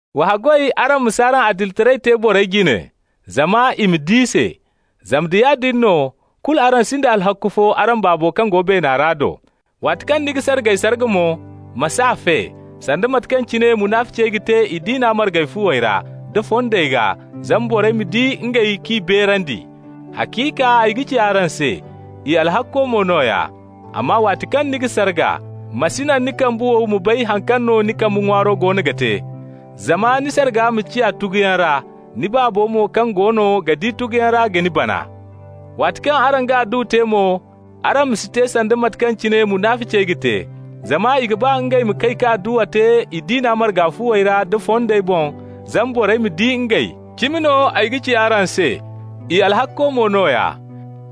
Wa haggoy araŋ ma s'araŋ adilitaray te borey jine, zama i ma di se. Zama da yaadin no, kulu araŋ sinda alhakku fo araŋ Baabo kaŋ go beena ra do. Waati kaŋ ni ga sargay sarga mo, ma s'a fe, sanda mate kaŋ cine munaficey ga te i diina marga fuwey ra, da fondey gaa, zama borey ma di ngey k'i beerandi. Haciika ay ga ci araŋ se, i alhakko mo nooya. Amma waati kaŋ ni ga sarga, ma si naŋ ni kambe wow ma bay haŋ kaŋ no ni kambe ŋwaaro goono ga te, zama ni sarga ma ciya tuguyaŋ ra. Ni Baabo mo kaŋ goono ga di tuguyaŋ ra ga ni bana. Waati kaŋ araŋ ga adduwa te mo, araŋ ma si te sanda mate kaŋ cine munaficey ga te, zama i ga ba ngey ma kay ka adduwa te i diina marga fuwey ra da fondey boŋ, zama borey ma di ngey. Cimi no ay ga ci araŋ se, i alhakko mo nooya.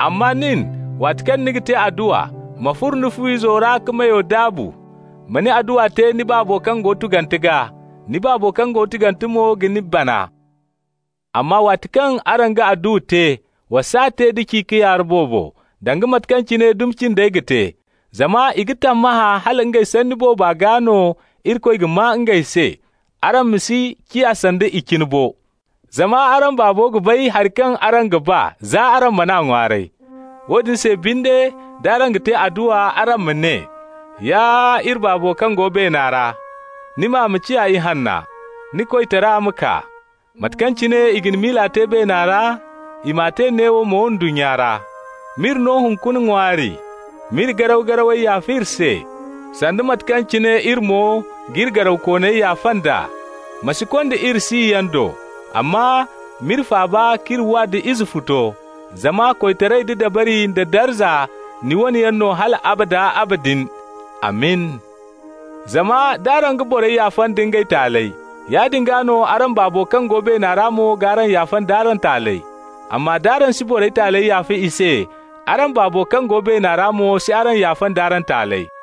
Amma nin, waati kaŋ ni ga te adduwa, ma furo ni fu-izo ra ka meyo daabu. Ma ni adduwa te ni Baabo kaŋ go tugante gaa. Ni Baabo kaŋ go tugante mo ga ni bana. Amma waati kaŋ araŋ ga adduwa te, wa s'a te da ci-ka-yaara boobo, danga mate kaŋ cine dumi cindey ga te. Zama i ga tammahã hala ngey sanni booba gaa no Irikoy ga maa ngey se. Araŋ ma si ciya sanda i cine bo. Zama araŋ Baabo ga bay hari kaŋ araŋ ga ba, za araŋ man'a ŋwaaray. Woodin se binde, d'araŋ ga te adduwa, araŋ ma ne: Ya iri Baabo kaŋ go beena ra, Ni maa ma ciya ihanna. Ni koytara ma kaa. Mate kaŋ cine i ga ni miila te beena ra, I m'a te neewo mo ndunnya ra. M'iri no hunkuna ŋwaari, M'iri garaw-garawey yaafa iri se, Sanda mate kaŋ cine iri mo g'iri garawkooney yaafa nd'a. Ma si konda iri siyaŋ do, Amma m'iri faaba k'iri wa da Izefuto. Zama koytaray da dabari nda darza, Ni wane yaŋ no hal abada abadin. Amin. Zama d'araŋ ga borey yaafa nda ngey taaley, yaadin gaa no araŋ Baabo kaŋ go beena ra mo g'araŋ yaafa nd'araŋ taaley. Amma d'araŋ si borey taaley yaafa i se, araŋ Baabo kaŋ go beena ra mo si araŋ yaafa nd'araŋ taaley.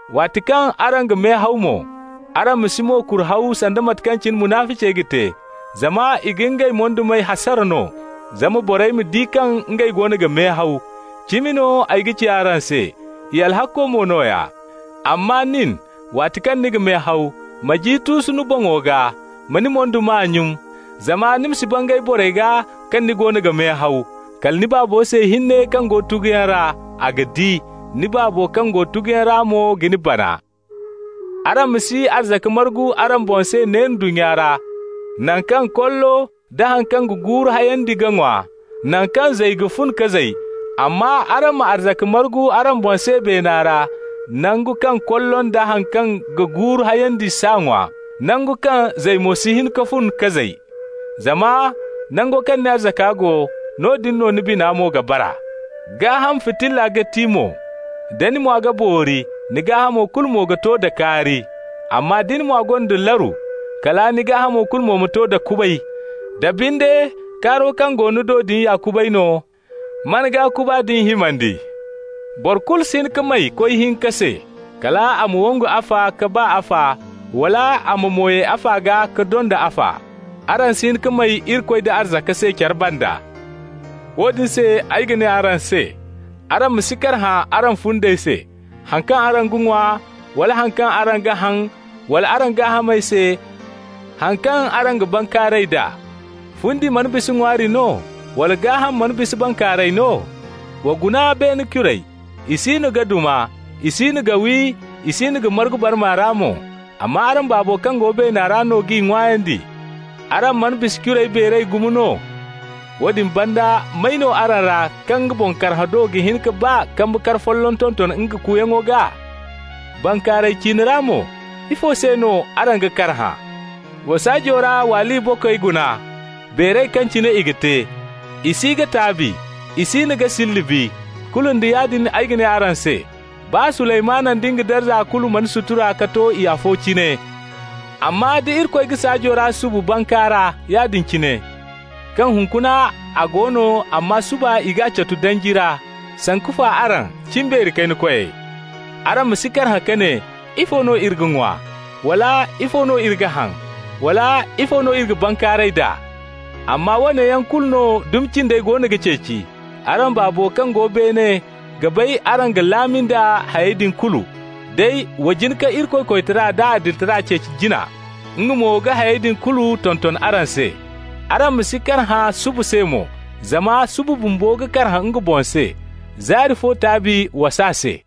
Waati kaŋ araŋ ga mehaw mo, araŋ ma si mo-kura haw, sanda mate kaŋ cine munaficey ga te. Zama i ga ngey moydumey hasara no, zama borey ma di kaŋ ngey goono ga mehaw. Cimi no ay ga ci araŋ se: i alhakko mo nooya. Amma nin, waati kaŋ ni ga mehaw, ma ji tuusu ni boŋo gaa, ma ni moyduma nyun, zama ni ma si bangay borey gaa kaŋ ni goono ga mehaw, kala ni Baabo se hinne kaŋ go tuguyaŋ ra. A ga di. Ni Baabo kaŋ go tuguyaŋ ra mo ga ni bana. Araŋ ma si arzaka margu araŋ boŋ se ne ndunnya ra, naŋ kaŋ kollo nda haŋ kaŋ ga guuru hayandi ga ŋwa, naŋ kaŋ zay mo ga fun ka zay. Amma araŋ ma arzaka margu araŋ boŋ se beena ra, nangu kaŋ kollo nda haŋ kaŋ ga guuru hayandi s'a ŋwa, nangu kaŋ zay mo si hin ka fun ka zay. Zama nango kaŋ ni arzaka go, noodin no ni bina mo ga bara. Gaaham fitilla ga ti mo. Da ni mwa ga boori, ni gaahamo kulu mo ga to da kaari. Amma da ni mwa gonda laru, kala ni gaahamo kulu ma to da kubay. Da binde, kaaro kaŋ go ni do din ya kubay no, man gaa kuba din himandi! Boro kulu si hin ka may koy hinka se. Kal a ma wangu afa, ka ba afa, wala a ma mo ye afa gaa, ka donda afa. Araŋ si hin ka may Irikoy da arzaka se care banda. Woodin se no ay ga ne araŋ se: araŋ ma si karhã araŋ fundey se, haŋ kaŋ araŋ ga ŋwa, wala haŋ kaŋ araŋ ga haŋ, wala araŋ gaahamey se, haŋ kaŋ araŋ ga bankaaray d'a. Fundi mana bisa ŋwaari no, wala gaaham mana bisa bankaaray no? Wa guna beene curey. I siino ga duma, i siino ga wi, i siino ga margu barma ra mo. Amma araŋ Baabo kaŋ go beena ra no g'i ŋwaayandi. Araŋ mana bisa curey beeray gumo no? Woodin banda, may no araŋ ra kaŋ nga boŋ karhã do ga hin ka baa kambe kar folloŋ tonton nga kuuyaŋo gaa? Bankaaray ciine ra mo, ifo se no araŋ ga karhã? Wa saajo ra waaliya bokey guna, beeray kaŋ cine i ga te. I si ga taabi, i siino ga silli bi. Kulu nda yaadin, ay ga ne araŋ se: baa Suleymanu nda nga darza kulu mana sutura ka to i afo cine. Amma da Irikoy ga saajo ra subu bankaara yaadin cine, kaŋ hunkuna a go no, amma suba i g'a catu danji ra, sanku fa araŋ, cimbeeri kayna koyey? Araŋ ma si karhã ka ne: ‹Ifo no iri ga ŋwa?› wala: ‹Ifo no iri ga haŋ?› wala: ‹Ifo no iri ga bankaaray d'a?› Amma woone yaŋ kulu no dumi cindey goono ga ceeci. Araŋ Baabo kaŋ go beene ga bay araŋ ga laami nda hayey din kulu. Day wa jin ka Irikoy koytara d'a adilitara ceeci jina, nga mo ga hayey din kulu tonton araŋ se. Araŋ ma si karhã suba se mo, zama suba bumbo ga karhã nga boŋ se. Zaari fo taabi waas'a se.